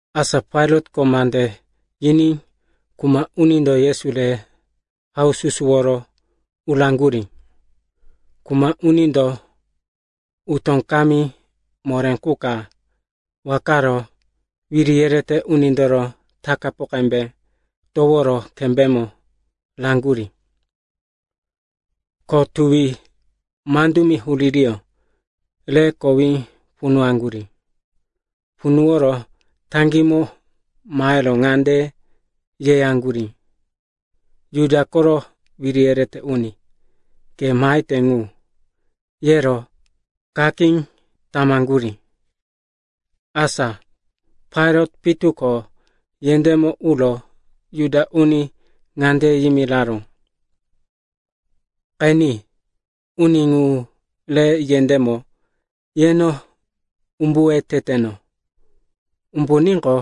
Asa Pailatko mande yiní kuma unindo Yesu re haususuworo uraŋgurí. Kuma unindo utó kamí moré qu ka wakaro wiri yerete unindoro takapu qembe toworo kembémo raŋgurí. Ko tuwi mandumi huririyó re kowí punuwaŋgurí. Punuworo taŋgímo maheyoro ŋande yeyaŋgurí, “Juda koro wiri yerete uni, ke mahete ŋu!” yero kakí tamaŋgurí. Asa Pailat pitu ko yendémo uro Juda uni ŋande yimiraró, “Qeni, uni ŋu re yendémo yeno umbuwe teteno. Umbuníqo,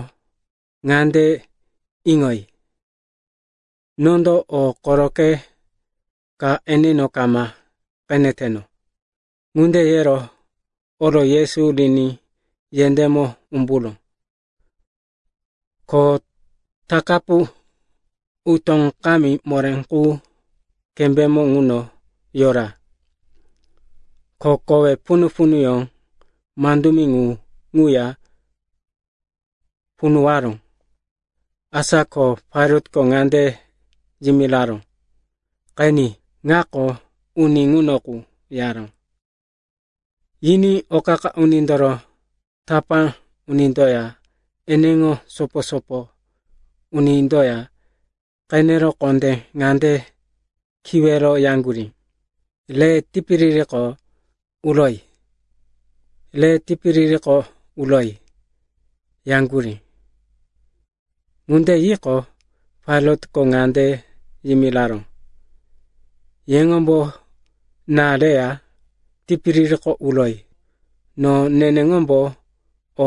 ŋande iŋoyi, nondo o koroqe ka eneno kama qeneteno.” Ŋunde yero oro Yesu riní yendémo umburó. Ko takapu utó kamí moré qu kembémo ŋuno yora. Ko kowe punu-punuyó mandumi ŋu ŋuya punuwaró. Asa ko Pailatko ŋande yimiraró, “Qeni. Ŋako uni ŋuno qu,” yaró. Yiní o qa-qa unindoro tapá unindoya eneŋo sopo-sopo unindoya qenero kondé ŋande kiwero yaŋgurí, “Re tipiririko uroyi! Re tipiririko uroyi!” yaŋgurí. Ŋunde yiqo, Pailatko ŋande yimiraró, “Yeŋombo na reya tipiririko uroyi. No neneŋombo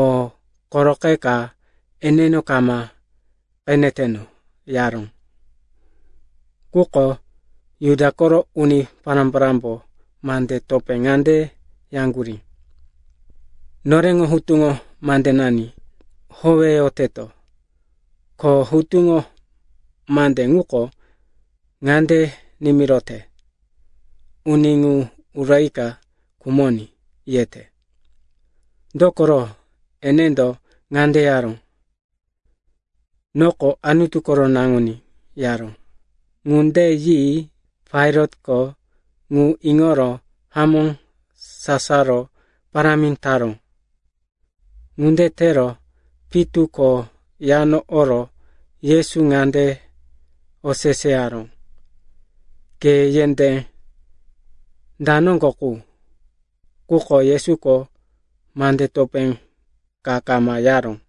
o koroqe ka eneno kama qeneteno,” yaró. Quko Juda koro uni pará-parámbo mande topé ŋande yaŋgurí, “Noreŋo hutuŋo mandenani howeyoteto, ko hutuŋo mande ŋuko ŋande nimirote, uni ŋu urika khumoní, yete. Dokoro, enendo ŋande yaró, ‘Noko Anutu koro Naŋuní,’ yaró.” Ŋunde yi Pailatko ŋu iŋoro hamó sasaro parámi taró. Ŋunde tero pitu ko yano oro Yesu ŋande oseseyaró, “Ke yendé da noŋgo qu?” Quko Yesuko mande topé ka kama yaró.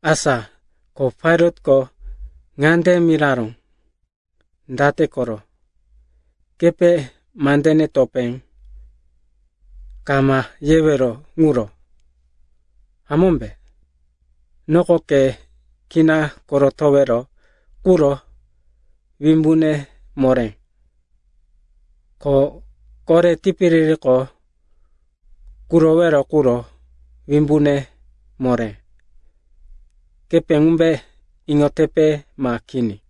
Asa ko Pailatko ŋande miraró, “Date koro? Kepe mandene topé kama yewero ŋuro, hamómbe? Noko ke kina korotowero quro wimbune moré, ko kore tipiririko kurowero quro wimbune moré. Kepe ŋumbe iŋotepe ma kini?”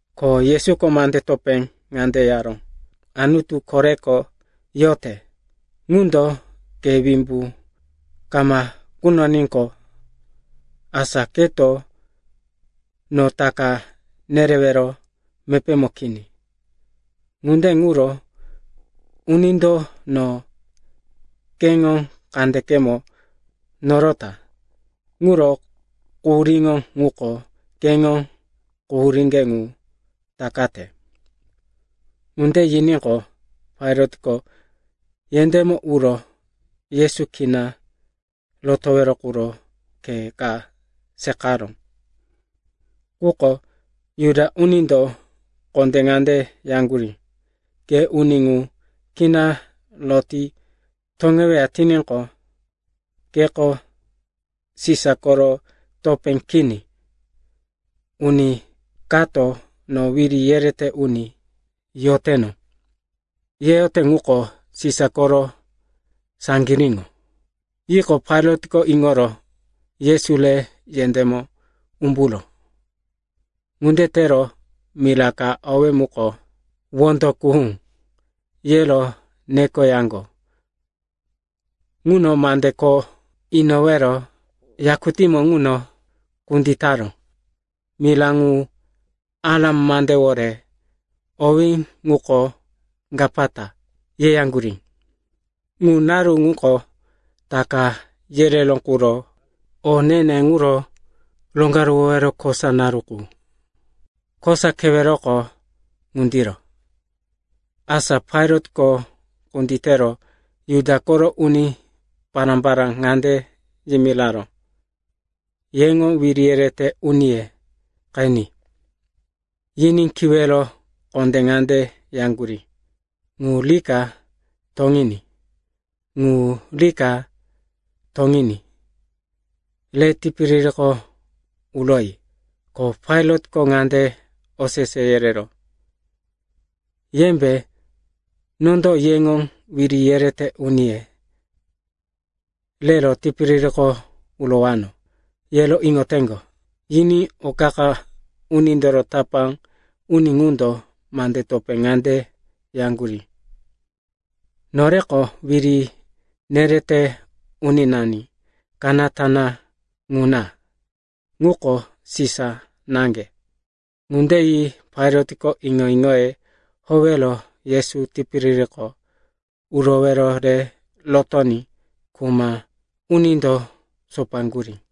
Ko Yesuko mande topé ŋande yaró, “Anutu koreko yote ŋundo ke wimbu kama kunoníqo, asa keto no taka nerewero mepémo kini. Ŋunde ŋuro unindo no keŋo kandekemo norota ŋuro quhuríŋo ŋuko keŋo quhuríŋge ŋu takate.” Ŋunde yiníqo, Pailatko yendémo uro Yesu kina rotowero quro khe ka seqaró. Quko Juda unindo kondé ŋande yaŋgurí, “Ke uni ŋu kina roti toŋeweya tiníqo, keko Sisa koro topé kini. Uni kato, no wiri yerete uni yoteno, yeyote ŋuko Sisa koro saŋgiríŋo.” Yiqo, Pailatko iŋoro Yesu re yendémo umburó. Ŋunde tero mira ka owí muko, “Wondo Kuhú,” yero nekoyaŋgo ŋuno mande kho inowero yakutímo ŋuno kunditaró. (Mira ŋu Aram mandewore owí ŋuko “Gapata” yeyaŋgurí.) Ŋu naru ŋuko Taka yereró quro o ne-ne ŋuro Roŋgaruwowero kosa naru qu, kosa keweroko ŋundiro. Asa Pailatko kunditero Juda koro uni pará-pará ŋande yimiraró, “Yeŋo wiri yerete uniye qeni.” Yiní kiwero kondé ŋande yaŋgurí, “Ŋu rika toŋiní! Ŋu rika toŋiní! Re tipiririko uroyi!” Ko Pailatko ŋande osese yereró, “Yembe, nondo yeŋo wiri yerete uniye rero tipiririko urowano, yero iŋoteŋgo?” Yiní o qa-qa unindoro tapá uni ŋundo mande topé ŋande yaŋgurí, “Noreko wiri nerete uninani kanata ŋuna. Ŋuko Sisa naŋge!” Ŋunde yi Pailatko iŋo-iŋoye howero Yesu tipiririko urowero re rotoní kuma unindo sopoyaŋgurí.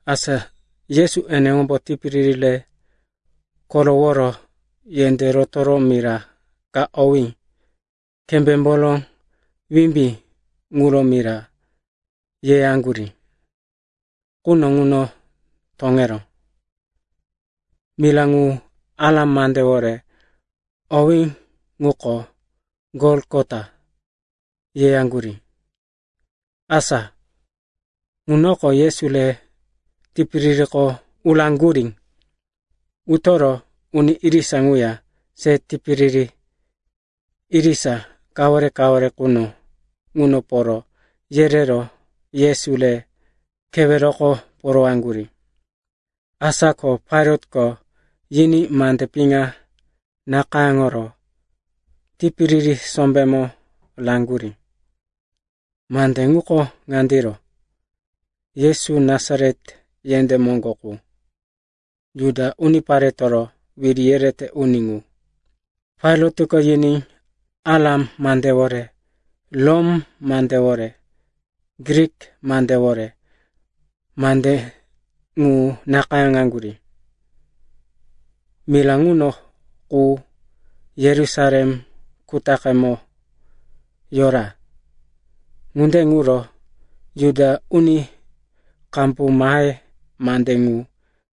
Asa Yesu eneŋombo tipiriri re koroworo yendé rotoro mira ka owí Kembémboro Wimbí ŋuro mira yeyaŋgurí quno ŋuno toŋeró. (Mira ŋu Aram mandewore owí ŋuko “Golgota” yeyaŋgurí.) Asa ŋunoko Yesu re tipiririko uraŋgurí. Utoro uni irisa ŋuya se tipiriri irisa kawore-kawore quno ŋuno poro yerero Yesu re keweroko porowaŋgurí. Asa ko Pailatko yiní mande piŋa nakayáŋoro tipiriri sombémo raŋgurí. Mande ŋuko ŋandiro: Yesu, Nasaret yendé moŋgo qu, Juda Uniparetoro Wiri Yerete Uni ŋu. Pailatko yiní Aram mandewore, Rom mandewore, Grik mandewore mande ŋu nakayáŋaŋgurí. Mira ŋuno qu Yerusalem kutaqemo yora. Ŋunde ŋuro Juda uni qambu mahe mande ŋu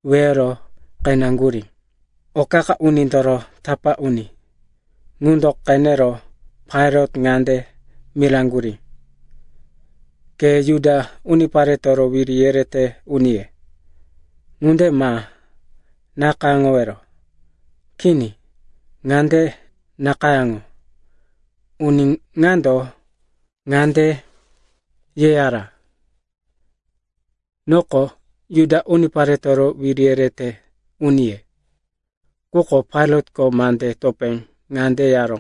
weyoro qeneŋgurí. O qa-qa unindoro tapá uni ŋundo qenero Pailat ŋande miraŋgurí, “Ke, ‘Juda Uniparetoro Wiri Yerete Uniye,’ ŋunde ma nakayáŋowero. Kini, ŋande nakayáŋo, ‘Uni ŋando ŋande yeyara, “Noko Juda Uniparetoro Wiri Yerete Uniye.”’” Quko Pailatko mande topé ŋande yaró,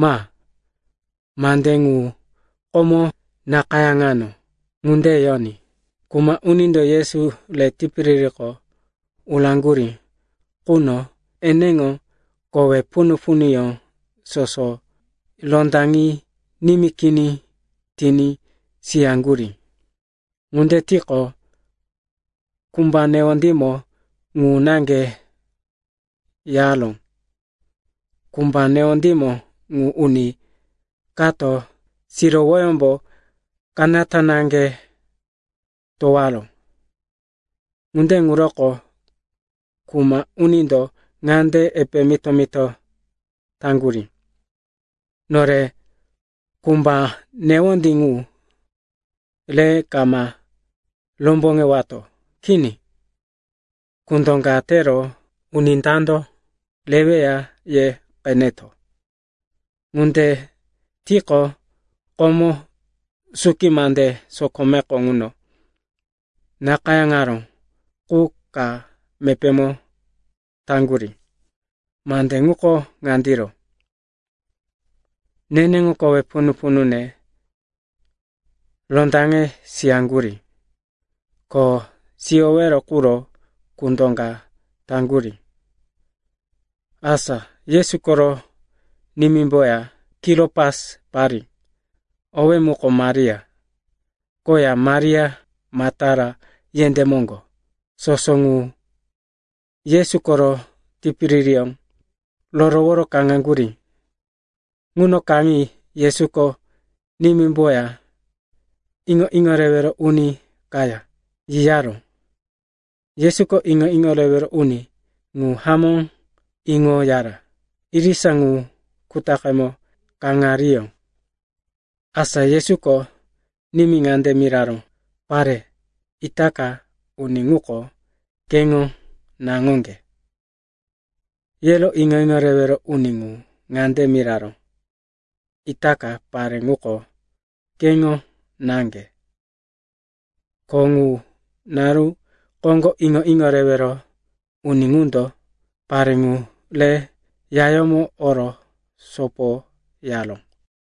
“Ma. Mande ŋu komo nakayáŋano ŋunde yoní.” Kuma unindo Yesu re tipiririko uraŋgurí quno eneŋo kowe punu-punuyó soso rondaŋi nimí kini tiní siyaŋgurí. Ŋunde tiqo, kumba newondímo ŋu naŋge yaró. Kumba newondímo ŋu uni kato sirowoyómbo kanata naŋge towaró. Ŋunde ŋuroko kuma unindo ŋande epe mito-mito taŋgurí, “Nore kumba newondí ŋu re kama romboŋewato. Kini, kundo ka tero uni dando reweya ye qeneto.” Ŋunde tiqo, komo suki mande sokomeko ŋuno nakayáŋaró qu ka mepémo taŋgurí. Mande ŋuko ŋandiro: “Neneŋo kowe punu-punune rondaŋe siyaŋgurí. Ko siyowero quro kundo ka taŋgurí.” Asa Yesu koro nimímboya Kilopasi parí, owí muko Maria, koya Maria Maktala yendé moŋgo, soso ŋu Yesu koro tipiririyó roroworo kaŋaŋgurí. Ŋuno kaŋi Yesuko nimímboya iŋo-iŋo rewero uni kaya yiyaró. Yesuko iŋo-iŋo rewero uni ŋu hamó iŋoyara. Irisa ŋu kutaqemo kaŋariyó. Asa Yesuko nimí ŋande miraró, “Pare, itaka uni ŋuko keŋo naŋoŋge.” Yero iŋo-iŋo rewero uni ŋu ŋande miraró, “Itaka pare ŋuko keŋo náŋge.” Ko ŋu naru koŋgo iŋo-iŋo rewero uni ŋundo pare ŋu re yayómo oro sopoyaró.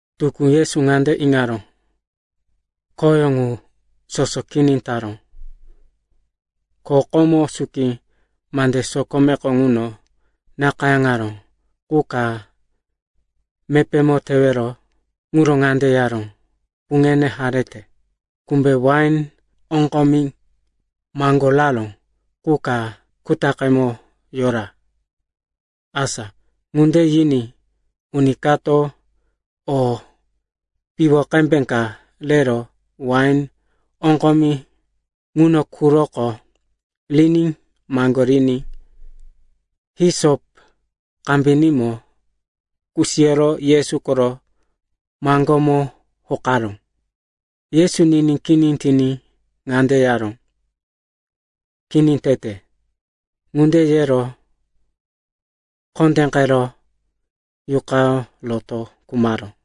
Tukú Yesu ŋande iŋaró, khoyó ŋu soso kini taró. Ko komo suki mande sokomeko ŋuno nakayáŋaró qu ka mepémo tewero quro ŋande yaró, “Puŋene harete.” Kumbe wain oŋgomi maŋgoraró qu ka kutaqemo yora. Asa ŋunde yiní uni kato o piwo qembe ka rero wain oŋgomi ŋuno quroko riní maŋgoriní hisop kambinímo kusiyoro Yesu koro maŋgómo hokaró. Yesu niní kini tiní ŋande yaró, “Kini tete.” Ŋunde yero kondéqero yuqayó roto khumaró.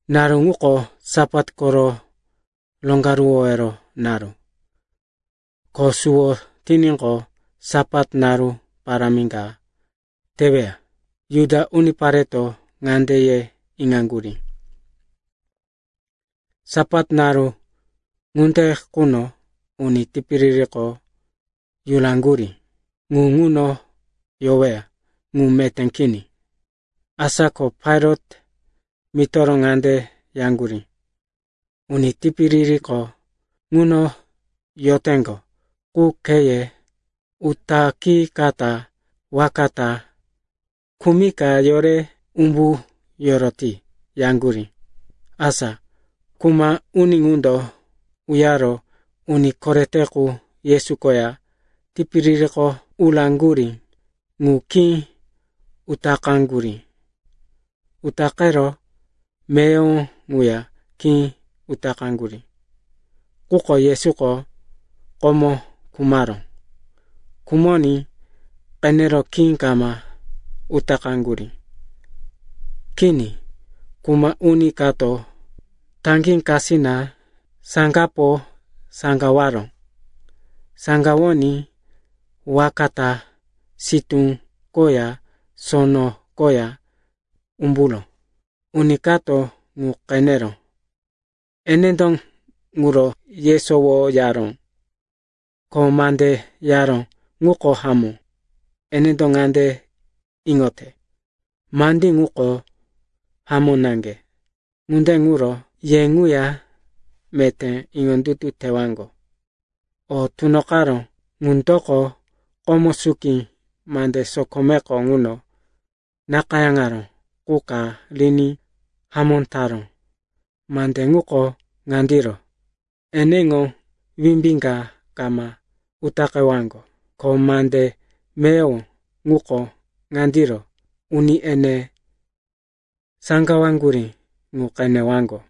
Naru ŋuko Sapat koro roŋgaruwowero naru, ko suwo tiníqo, Sapat naru parámi ka teweya. Juda unipareto ŋande ye iŋaŋgurí, Sapat naru ŋunde quno uni tipiririko yuraŋgurí ŋu ŋuno yoweya ŋu meté kini. Asa ko Pailat mitoro ŋande yaŋgurí, “Uni tipiririko ŋuno yoteŋgo ŋu kheye utaqikata waka ta khumika yore umbu yoroti,” yaŋgurí. Asa kuma uni ŋundo uyaro uni korete qu Yesu koya tipiririko uraŋgurí ŋu khí utaqaŋgurí. Utaqero meyowo ŋuya khí utaqaŋgurí. Quko Yesuko komo khumaró. Khumoní qenero khí kama utaqaŋgurí. Kini, kuma uni kato taŋgí kasina saŋgapo saŋgawaró. Saŋgawoní waka ta sitú koya sono koya umburó. Uni kato ŋu qeneró, enendo ŋuro yesowo yaró. Ko mande yaró ŋuko hamó. Enendo ŋande iŋote, mandí ŋuko hamó naŋge. Ŋunde ŋuro ye ŋuya meté iŋondutu tewaŋgo. O tunoqaró ŋundoko komo suki mande sokomeko ŋuno nakayáŋaró qu ka riní hamó taró. Mande ŋuko ŋandiro, “Eneŋo wimbí ka kama utaqewaŋgo.” Ko mande meyowo, ŋuko ŋandiro, “Uni ene saŋgawaŋgurí ŋu qenewaŋgo.”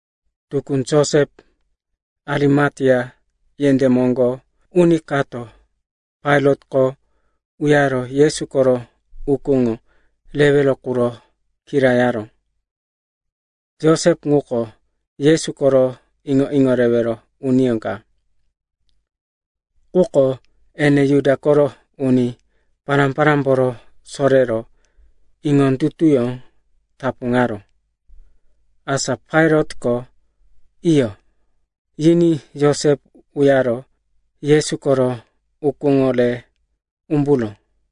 Tukú Josep, Arimatea yendé moŋgo uni kato Pailatko uyaro Yesu koro ukúŋo rewero quro kirayaró. Josep ŋuko Yesu koro iŋo-iŋo rewero uniyó ka, quko ene Juda koro uni pará-parámboro sorero iŋondutuyó tapuŋaró. Asa Pailatko, “Iyo,” yiní Josep uyaro Yesu koro ukúŋo re umburó.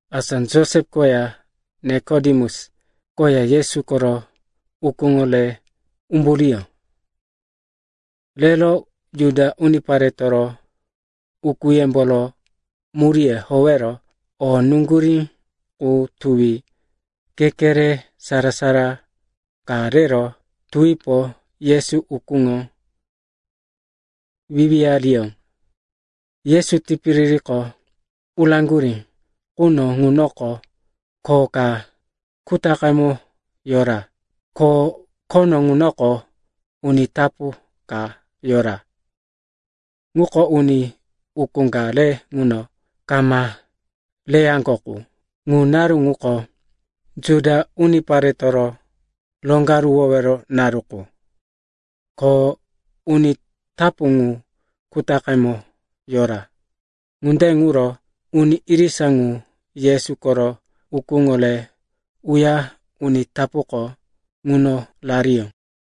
Asa Josep koya Nikodemus koya Yesu koro ukúŋo re umburiyó. Rero Juda uniparetoro ukúyemboro muríye howero o nuŋgurí ŋu tuwi kekere sara-sara ka rero tuwipo Yesu ukúŋo wiwiyariyó. Yesu tipiririko uraŋgurí quno ŋunoko kho ka kutaqemo yora. Ko khono ŋunoko uni tapu ka yora, ŋuko uni ukú ka re ŋuno kama reyaŋgo qu. Ŋu naru ŋuko Juda uniparetoro Roŋgaruwowero Naru qu, ko uni tapu ŋu kutaqemo yora. Ŋunde ŋuro uni irisa ŋu Yesu koro ukúŋo re uya uni tapuko ŋuno rariyó.